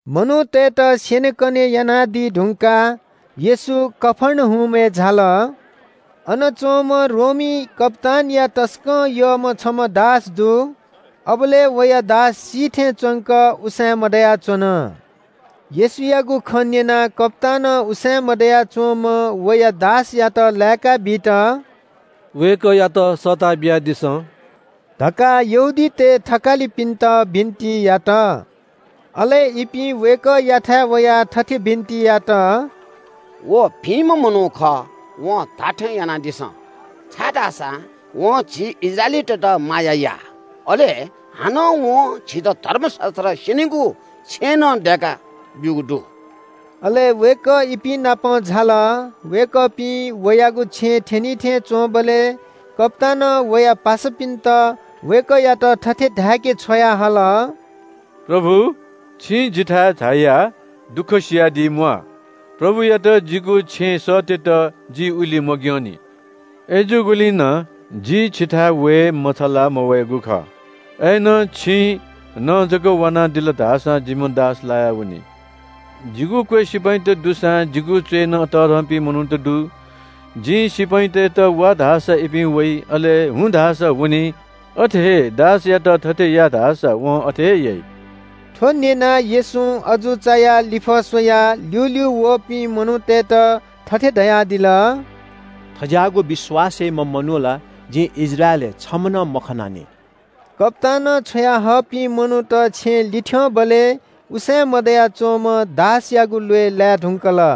मनूतय्‌त स्‍यनेकने यानादी धुंकाः येशू कफर्नहुमय् झाल। अन च्‍वंम्‍ह रोमी कप्‍तानया तसकं यःम्‍ह छम्‍ह दास दु। अबलय् वया दास सी थें च्‍वंक, उसाँय् मदयाच्‍वन। येशूयागु खँ न्‍यनाः कप्‍तानं उसाँय् मदया च्‍वंम्‍ह वया दासयात लाय्‌काबीत “वय्‌कःयात सःता बियादिसँ” धकाः यहूदीतय् थकालिपिन्‍त बिन्‍ति यात। अले इपिं वय्‌कःयाथाय् वयाः थथे बिन्‍ति यात – “व भिंम्‍ह मनू खः, वं धाःथें यानादिसँ, छाय्‌धाःसा वं झी इस्राएलीतय्‌त माया याः। अले हानं वं झीत धर्मशास्‍त्र स्‍यनीगु छेँनं दय्‌काब्‍यूगु दु।” अले वय्‌कः इपिं नाप झाल। वय्‌कःपिं वयागु छेँय् थ्‍यनिथें च्‍वंबलय् कप्‍तानं वया पासापिन्‍त वय्‌कःयात थथे धाय्‌के छ्वयाहल – “प्रभु, छिं जिथाय् झायाः दुःख सियादी म्‍वाः। प्रभुयात जिगु छेँय् सःतेत जि उलि मग्‍यंनि। अय्‌जूगुलिं नं जि छिथाय् वये मछालाः मवयागु खः। अय्‌नं छिं न जक वानादिल धाःसां जिम्‍ह दास लायावनी। जिगु क्‍वय् सिपाइँत दुसां जिगु च्‍वय्‌नं तःधंपिं मनूत दु। जिं सिपाइँतय्‌त ‘वा’ धाःसा इपिं वइ। अले ‘हुँ’ धाःसा वनी। अथे हे दासयात ‘थथे या’ धाःसा वं अथे हे याइ।” थ्‍व न्‍यनाः येशूं अजू चायाः लिफः स्‍वयाः ल्‍यूल्‍यू वःपिं मनूतय्‌त थथे धयादिल – “थज्‍याःगु विश्‍वास याइम्‍ह मनू ला जिं इस्राएलय् छम्‍ह नं मखनानि।” कप्‍तानं छ्वयाहःपिं मनूत छेँय् लिथ्‍यंबलय् उसाँय् मदया च्‍वंम्‍ह दासयागु ल्‍वय् लाये धुंकल।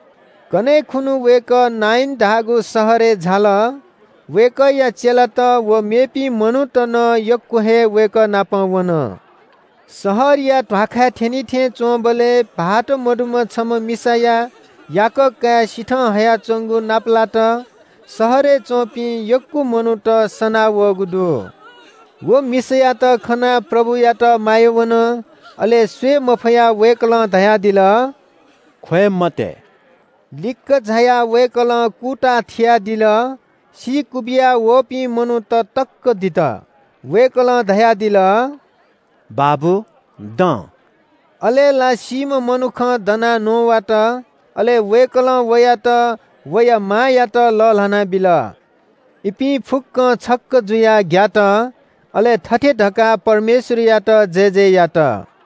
कन्‍हय् खुन्‍हु वय्‌कः नाइन धाःगु शहरय् झाल। वय्‌कःया चेलात व मेपिं मनूत नं यक्‍व हे वय्‌कः नाप वन। शहरया ध्‍वाखाय् थ्‍यनी थें च्‍वंबलय् भाःत सीधुंकूम्‍ह छम्‍ह मिसाया याकः काय् सिथं हयाच्‍वंगु नापलात। शहरय् च्‍वंपिं यक्‍व मनूत सनां वःगु दु। व मिसायात खनाः प्रभुयात माया वन। अले स्‍वये मफयाः वय्‌कलं धयादिल – “ख्‍वये मते।” लिक्‍क झायाः वय्‌कलं कूताः थियादिल। सी क्‍वबिया वःपिं मनूत तक्‍क दित। वय्‌कलं धयादिल – “बाबु दँ।” अले ला सीम्‍ह मनुखं दनाः न्‍ववात। अले वय्‌कलं वयात वया मांयात लःल्‍हाना बिल। इपिं फुक्‍कं छक्‍क जुयाः ग्‍यात, अले थथे धकाः परमेश्‍वरयात जयजय यात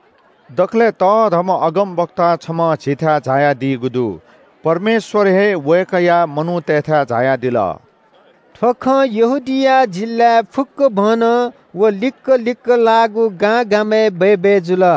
– “दकलय् तःधंम्‍ह अगमवक्ता छम्‍ह झीथाय् झायादीगु दु। परमेश्‍वर हे वय्‌कःया मनूतय्‌थाय् झायादिल।” थ्‍व खँ यहूदिया जिल्‍लाय् फुक्‍कभनं व लिक्‍क लिक्‍क लाःगु गांगामय् बय्‌बय् जुल।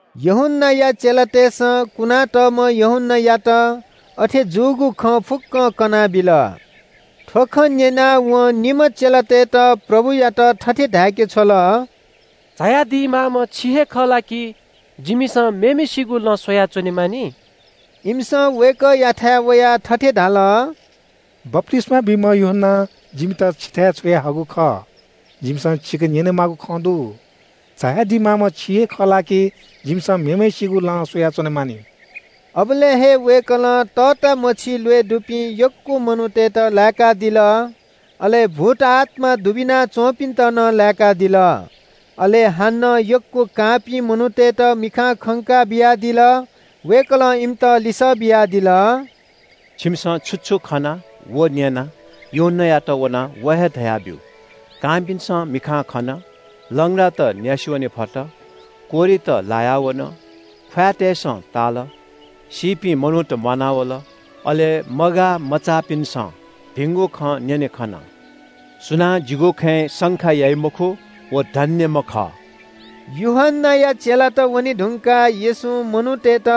यूहन्‍नाया चेलातय्‌सं कुनातःम्‍ह यूहन्‍नायात अथे जूगु खँ फुक्‍कं कनाबिल। थ्‍व खँ न्‍यनाः वं निम्‍ह चेलातय्‌त प्रभुयात थथे धाय्‌के छ्वल – “झायादी माःम्‍ह छि हे खः ला कि जिमिसं मेम्‍हय्‌सिगु लँ स्‍वयाच्‍वने मानि?” इमिसं वय्‌कःयाथाय् वयाः थथे धाल – “बप्‍तिस्‍मा बीम्‍ह यूहन्‍नां जिमित छिथाय् छ्वयाहःगु खः। जिमिसं छिके न्‍यनेमाःगु खँ दु। झायादी माःम्‍ह छि हे खः ला कि जिमिसं मेम्‍हय्‌सिगु लँ स्‍वयाच्‍वने मानि?” अबलय् हे वय्‌कलं तःतामछि ल्‍वय् दुपिं यक्‍व मनूतय्‌त लाय्‌कादिल। अले भूतआत्‍मा दुबिना च्‍वंपिन्‍त नं लाय्‌कादिल। अले हानं यक्‍व कांपिं मनूतय्‌त मिखां खंका बियादिल। वय्‌कलं इमित लिसः बियादिल – “छिमिसं छु छु खना व न्‍यना, यूहन्‍नायात वनाः व हे धयाब्‍यु। कांपिन्‍सं मिखां खन, लंग्रात न्‍यासि वने फत, कोह्रित लाया वन, ख्‍वाँय्‌तय्‌सं ताल, सीपिं मनूत म्‍वानावल, अले मगाःमचाःपिन्‍सं भिंगु खँ न्‍यने खन। सुनां जिगु खँय् शंका याइ मखु व धन्‍यम्‍ह खः।” यूहन्‍नाया चेलात वने धुंकाः येशूं मनूतय्‌त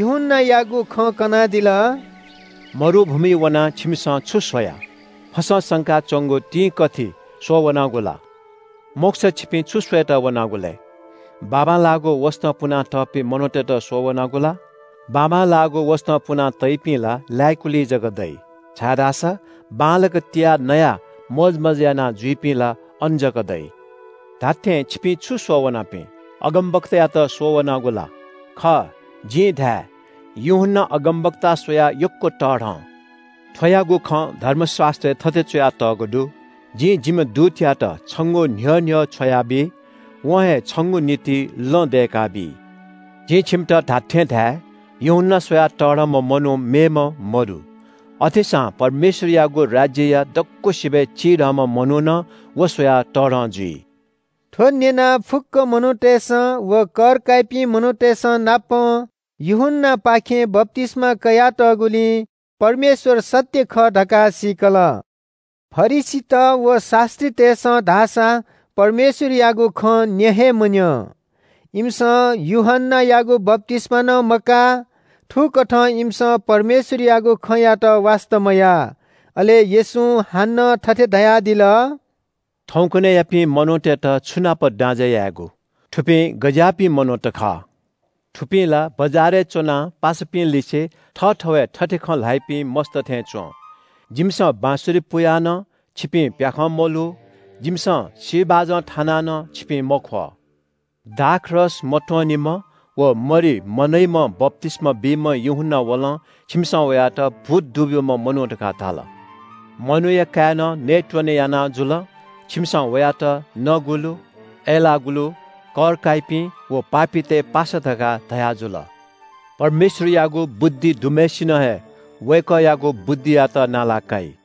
यूहन्‍नायागु खँ कनादिल – “मरुभूमिइ वनाः छिमिसं छु स्‍वया? फसं संका च्‍वंगु तिंकथि स्‍वःवनागु ला? मखुसा छिपिं छु स्‍वयेत वनागु लय्? बाबांलाःगु वसतं पुनातःपिं मनूतय्‌त स्‍वःवनागु ला? बाबांलाःगु वसतं पुना तइपिं ला लाय्‌कुलिइ जक दइ, छाय्‌धाःसा बांलाक तियाः नयाः मोजमज्‍जा यानाजुइपिं ला अन जक दइ। धात्‍थें छिपिं छु स्‍वः वनापिं? अगमवक्तायात स्‍वःवनागु ला? खः, जिं धाये – यूहन्‍ना अगमवक्ता स्‍वयाः यक्‍व तःधं। थ्‍वयागु खँ धर्मशास्‍त्रय् थथे च्‍वयातःगु दु – “‘जिं जिम्‍ह दूतयात छंगु न्‍ह्यः न्‍ह्यः छ्वयाबी। वं हे छंगु निंतिं लँ दय्‌काबी।’ “जिं छिमित धात्‍थें धाये – यूहन्‍ना स्‍वयाः तःधंम्‍ह मनू मेम्‍ह मदु। अथेसां परमेश्‍वरयागु राज्‍यया दक्‍वसिबय् चिधंम्‍ह मनू नं व स्‍वयाः तःधं जुइ।” थ्‍व न्‍यनाः फुक्‍क मनूतय्‌सं व कर काइपिं मनूतय्‌संनापं यूहन्‍नायापाखें बप्‍तिस्‍मा कयातःगुलिं परमेश्‍वर सत्‍य खः धकाः सीकल। फरिसीत व शास्‍त्रीतय्‌सं धाःसा परमेश्‍वरयागु खँ न्‍यँ हे मन्‍यं। इमिसं यूहन्‍नायागु बप्‍तिस्‍मा नं मकाः। थुकथं इमिसं परमेश्‍वरयागु खँयात वास्‍ता मयाः। अले येशूं हानं थथे धयादिल – “थौंकन्‍हय्‌यापिं मनूतय्‌त छु नाप दाँजय् यायेगु? थुपिं गज्‍याःपिं मनूत खः? थुपिं ला बजारय् च्‍वनाः पासापिंलिसे थःथवय् थथे खँ ल्‍हाइपिं मस्‍त थें च्‍वं – “‘जिमिसं बाँसुरी पुयाः नं छिपिं प्‍याखं मल्‍हू, जिमिसं सी बाजं थानाः नं छिपिं मख्‍वः।’ “दाखरस मत्‍वनीम्‍ह व मरि मनइम्‍ह बप्‍तिस्‍मा बीम्‍ह यूहन्‍ना वलं छिमिसं वयात ‘भूत दुब्‍यूम्‍ह मनू’ धकाः धाल। मनूया काय्‌नं नयेत्‍वने याना जुल। छिमिसं वयात ‘नगुलु, अय्‌लाःगुलुत, कर काइपिं व पापीतय् पासा’ धकाः धयाजुल। परमेश्‍वरयागु बुद्धि दुम्‍हय्‌सिनं हे वय्‌कःयागु बुद्धियात नाला काइ।”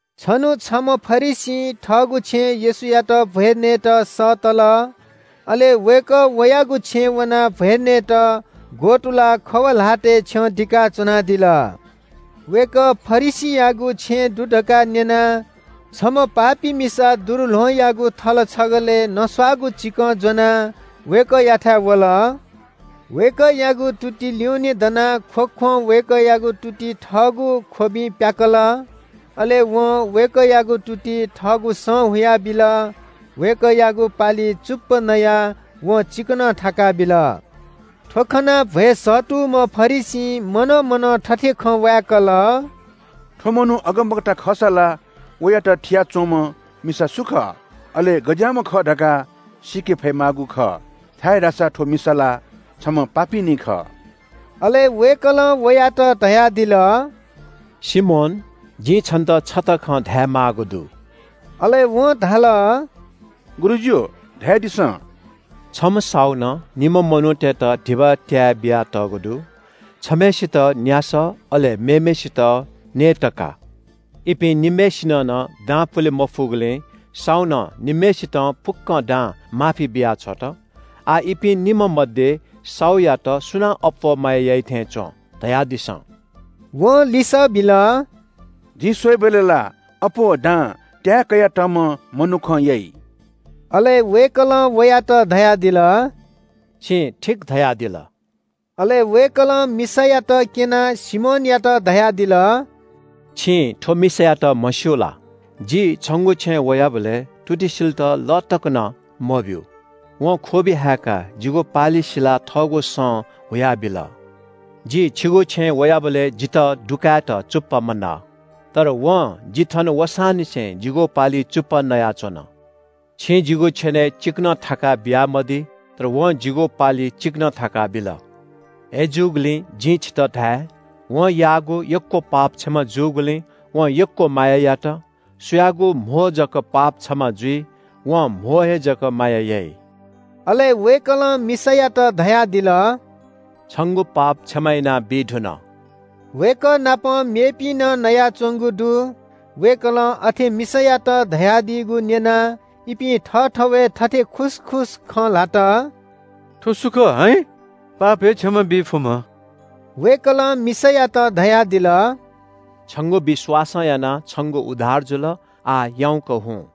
छन्‍हु छम्‍ह फरिसीं थःगु छेँय् येशूयात भ्‍वय् नयेत सःतल। अले वय्‌कः वयागु छेँय् वनाः भ्‍वय् नयेत ग्‍वतुलाः खव ल्‍हातय् छ्यं दिका च्‍वनादिल। वय्‌कः फरिसीयागु छेँय् दु धकाः न्‍यनाः छम्‍ह पापी मिसा दुरुल्‍वहंयागु थल छगलय् नस्‍वाःगु चिकं ज्‍वनाः वय्‌कःयाथाय् वल। वय्‌कःयागु तुति ल्‍युने दनाः ख्‍वख्‍वं वय्‌कःयागु तुति थःगु ख्‍वबिं प्‍याकल। अले वं वय्‌कःयागु तुति थःगु सं हुयाबिल। वय्‌कःयागु पालिइ चुप्‍पा नयाः वं चिकनं थाका बिल। थ्‍व खनाः भ्‍वय् सःतूम्‍ह फरिसीं मनं मनं थथे खँ वाय्‌कल – “थ्‍व मनू अगमवक्ता खःसा ला वयात थिया च्‍वंम्‍ह मिसा सु खः, अले गज्‍याःम्‍ह खः धकाः सीके फयेमाःगु खः, छाय्‌धाःसा थ्‍व मिसा ला छम्‍ह पापीनी खः।” अले वय्‌कलं वयात धयादिल – “सिमोन, जिं छन्‍त छता खँ धायेमाःगु दु।” अले वं धाल – “गुरुजु, धयादिसँ।” “छम्‍ह साहुनं निम्‍ह मनूतय्‌त धिबा त्‍याये बियातःगु दु। छम्‍हय्‌सित न्‍यासः, अले मेम्‍हय्‌सित न्‍ययतका। इपिं निम्‍हय्‌सिनं नं दां पुले मफुगुलिं साहुनं निम्‍हय्‌सितं फुक्‍क दां माफी बियाछ्वत। आः इपिं निम्‍ह मध्‍ये साहुयात सुनां अप्‍वः माया याइ थें च्‍वं, धा सा?” वं लिसः बिल – “जिं स्‍वयेबलय् ला अप्‍वः दां त्‍याये कयातःम्‍ह मनुखं याइ।” अले वय्‌कलं वयात धयादिल – “छं ठीक धाल।” अले वय्‌कलं मिसायात क्‍यनाः सिमोनयात धयादिल – “छं थ्‍व मिसायात म्‍हस्‍यू ला? जि छंगु छेँय् वयाबलय् तुति सिलेत लः तक नं मब्‍यू। वं ख्‍वबि हाय्‌काः जिगु पालि सिलाः थःगु सं हुयाबिल। जि छिगु छेँय् वयाबलय् जितः दुकायेत चुप्‍पा मनः। तर वं जि थन वसांनिसें जिगु पालिइ चुप्‍पा नयाच्‍वन। छिं जिगु छेनय् चिकनं थाका बियामदी तर वं जिगु पालिइ चिकनं थाका बिल। “अय्‌जूगुलिं जिं छितः धाये – वं याःगु यक्‍व पाप क्षमा जूगुलिं वं यक्‍व माया यात। सुयागु कम जक पाप क्षमा जुइ, वं कम हे जक माया याइ।” अले वय्‌कलं मिसायात धयादिल – “छंगु पाप क्षमा यानाबी धुन।” वय्‌कः नाप मेपिं नं नयाच्‍वंगु दु। वय्‌कलं अथे मिसायात धयादीगु न्‍यनाः इपिं थःथवय् थथे खुसखुस खँ ल्‍हात – “थ्‍व सु खः, हाइँ? पाप हे क्षमा बी फुम्‍ह?” वय्‌कलं मिसायात धयादिल – “छंगु विश्‍वासं यानाः छंगु उद्धार जुल। आः याउँक हुँ।”